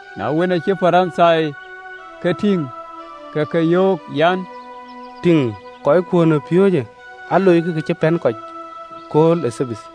Na wën, aacï Parithai ke tïŋ, ke ke yöök an, “Tïŋ, kɔckuön ë piööcë aloikï kë cï pɛ̈n kɔc ëkööl ë Thabath!”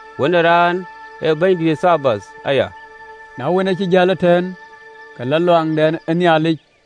Wën ë Raan ee Bɛ̈nydïït ë Thabath aya.” Na wën, acï jäl ëtɛ̈ɛ̈n, ku le ɣön ë Nhialic,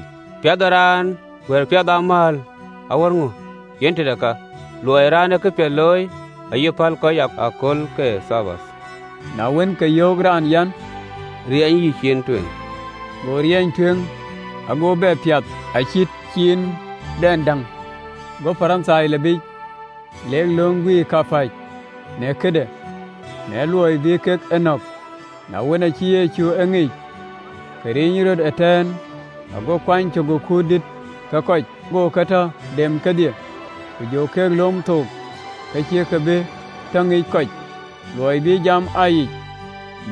Ku piath ë raan awär piath ë amääl aläl? Yen tëde ka, luɔi ee raan këpiɛth looi aye päl kɔc ë kööl ke Thabath. Na wën, ke yöök raan an, “Riɛnyë yïcin tueŋ.” Go riɛny tueŋ, ago bɛ piath acït ciindɛn däŋ. Go Parithai lɔ biic, lek löŋ guiir kapäc në këde, në luɔi bï kek e nɔ̈k. Na wën, acï Yecu e ŋic, ke ric rɔt ëtɛ̈ɛ̈n, ago kuany cök ë kuut dïït ke kɔc, go ke tɔ dem kedhie, ku jɔ ke lom thook, ke cïkï bï tɔ ŋic kɔc, luɔi bïï jam aa yic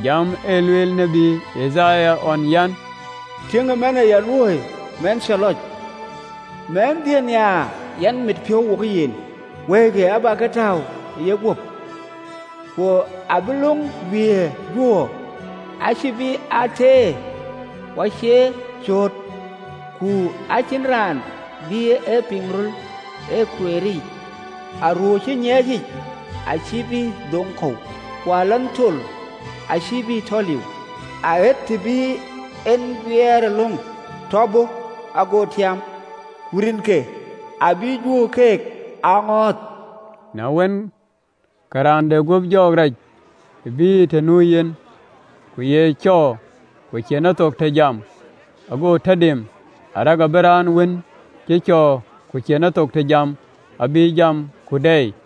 jam ë lueel tiët Yithaya ɣɔn an, (LXX). “Tiëŋkï awundï, raan cä lɔc, Mɛnhdiën nhiaar, yɛn mit piɔ̈u wokë yen, Wëikï abä ke tääu ë yeguöp, ku abï löŋ yic guiëër juöör. Acï bï aa teer, ku cie cööt, ku acïn raan bï e piŋ röl ë kuɛɛr yiic. Aruöör cï nyiɛɛcic acïï bï dhoŋ kɔ̈u, ku alanh tol acïï bï tɔ liu, Aɣet të bï en guiëërëlöŋ tɔ bɔ̈, ago tiam. Ku rinke abï juöör ke aa ŋɔ̈ɔ̈th.” Na wën, ke raan de guöp jɔŋ rac bïï yë të nu yen, ku ye cɔɔr, ku cïn ethok të jam, ago tɔ dem, arëk abï raan wën cï cɔɔr ku cïn ethok të jam abï jam ku dɛɛi.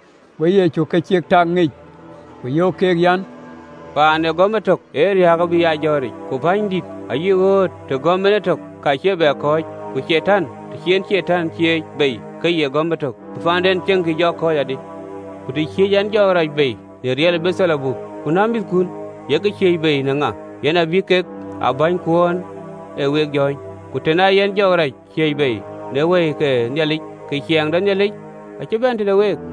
Go Yecu kë cïk tak ŋic, ku yöök keek an, “Ciɛɛŋ ee gɔ̈m etök ee riääk abï aa jɔ̈ɔ̈ric, ku pänydït ayï ɣöt, të gɔ̈m en etök, ka cïï bï kɔ̈ɔ̈c, ku Catan, të cï en Catan ciëëc bei, ka ye gɔ̈m etök, bï ciɛɛŋdɛn cieŋ jɔ kɔ̈ɔ̈c adï? Ku të ciëëc ɛn jɔɔk rac bei në riɛl ë Beeldhebub, ku na mïthkun, yek ke ciëëc bei në ŋa? Yen abï kek aa bänykuön ë week jɔ̈ɔ̈ny. Ku tën aa yɛn jɔɔk rac ciëëc bei në Wëi ke Nhialic, ke ciɛɛŋ de Nhialic acï bɛ̈n tëde week.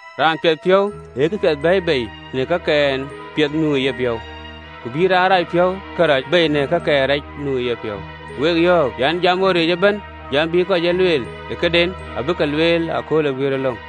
Raan piɛth piɔ̈u ee kapiɛth bɛ̈ɛ̈i bei në kakɛn piɛth nu ë yepiɔ̈u, ku bïï raan rac piɔ̈u karɛc bei në kakɛn rac nu ë yepiɔ̈u.” Ku wek yɔ̈ɔ̈k an, “Jam ɣɔ̈ric ëbɛ̈n jam bï kɔc aa lueel, këden abïk lueel ëkööl ë guiëërëlöŋ.